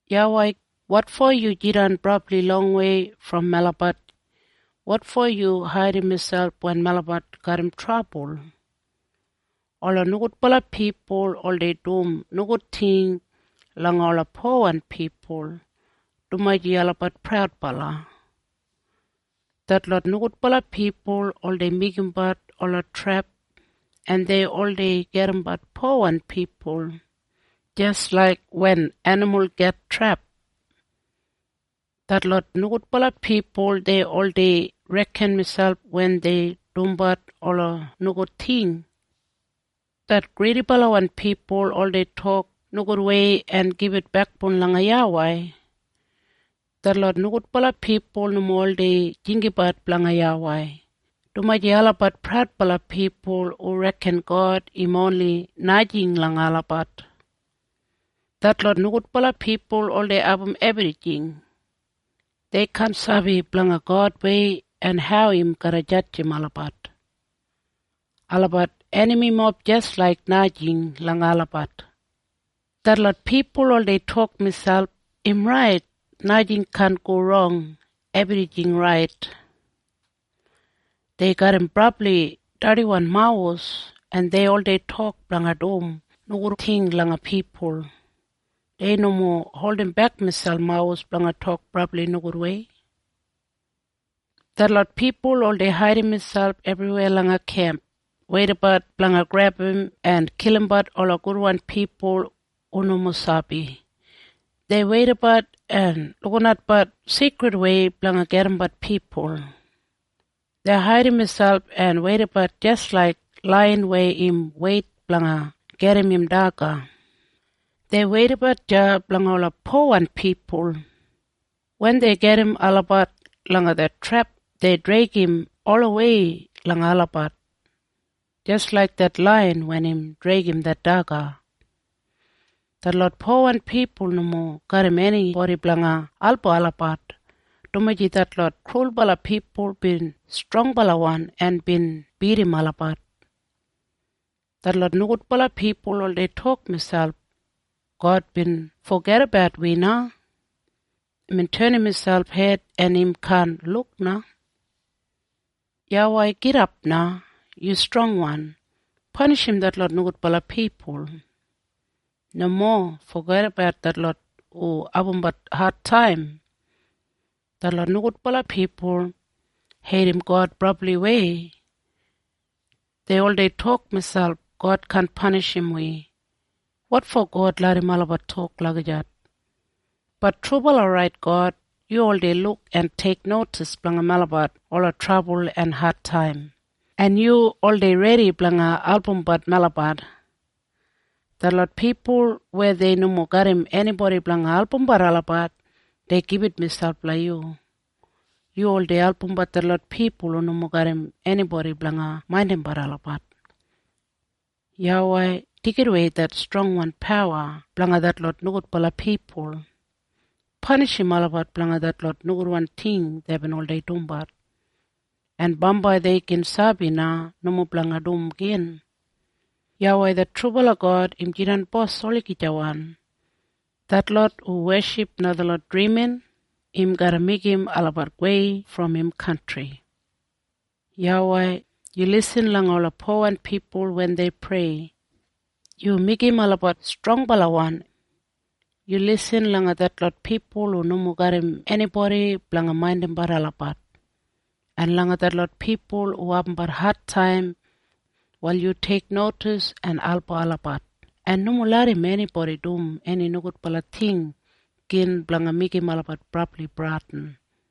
YAWEI, Wotfo yu jidan brabli longwei brom melabat? Wotfo yu haidim miselp wen melabat garram trabul? Ola nogudbala pipul oldei dum nogud ting langa ola powan pipul, dumaji olabat praudbala. Detlot nogudbala pipul oldei meigimbat ola trep en dei oldei gedimbat powan pipul, jis laik wen enimul git trep. Detlot nogudbala pipul dei oldei reken miselp wen dei dumbat ola nogud ting. Det gridibalawan pipul oldei tok nogudwei en gibit bekboun langa YAWEI. Detlot nogudbala pipul nomo oldei jinggabat blanga YAWEI, dumaji olabat praudbala pipul hu reken God im oni najing langa olabat. Detlot nogudbala pipul oldei abum ebrijing. Dei kaan sabi blanga Godwei en hau im garra jadjim olabat. Olabat enamimob jis laik najing langa olabat. Detlot pipul oldei tok miselp, “Im rait! Najing kaan go rong! Ebrijing rait!” Dei garram brabli dardiwan mawus, en dei oldei tok blanga dum nogud ting langa pipul. Dei nomo holdimbek miselp mawus blanga tok brabli nogudwei. Detlot pipul oldei haidim miselp ebriweya langa kemp, weidabat blanga grebum en kilimbat ola gudwan pipul hu nomo sabi. Dei weidabat en lukinatbat sigridwei blanga gedimbat pipul. Dei haidim miselp en weidabat jis laik laiyan weya im weit blanga gedim im daga. Dei weidabat deya blanga ola powan pipul. Wen dei gedim olabat langa det trep dei dregim olawei langa olabat, jis laik det laiyan wen im dregim det daga. Detlot powan pipul nomo garram enibodi blanga album olabat, dumaji detlot krulbala pipul bin strongbalawan en bin bidim olabat. Detlot nogudbala pipul oldei tok miselp, “God bin fogedabat wi na! Imbin tenim miselp hed en im kaan luk na.” YAWEI, gidap na. Yu strongwan. Panishim detlot nogudbala pipul. Nomo fogedabat detlot hu abumbat adtaim. Detlot nogudbala pipul heidim God brabliwei. Dei oldei tok miselp, “God kaan panishim wi.” Wotfo God larram olabat tok lagijat? Bat God, yu oldei luk en teiknodis blanga melabat ola trabul en adtaim, en yu oldei redi blanga albumbat melabat. Detlot pipul weya dei nomo garram enibodi blanga albumbat olabat, dei gibit miselp langa yu. Yu oldei albumbat detlot pipul hu nomo garram enibodi blanga maindimbat olabat. YAWEI, deigidawei det strongwan pawa blanga detlot nogudwan pipul. Panishim olabat blanga detlot nogudwan ting deibin oldei dumbat, en bambai dei gin sabi na nomo blanga dum igin. YAWEI det trubala God im jidan bos olagijawan. Detlot hu weship najalot drimin, im garra meigim olabat gowei brom im kantri. YAWEI, yu lisin langa ola powan pipul wen dei prei. Yu meigim olabat strongbalawan. Yu lisin langa detlot pipul hu nomo garram enibodi blanga maindimbat olabat, en langa detlot pipul hu abumbat adtaim. Wal yu teiknodis en album olabat, en nomo larram enibodi dum eni nogudbala ting igin blanga meigim olabat brabli bradin.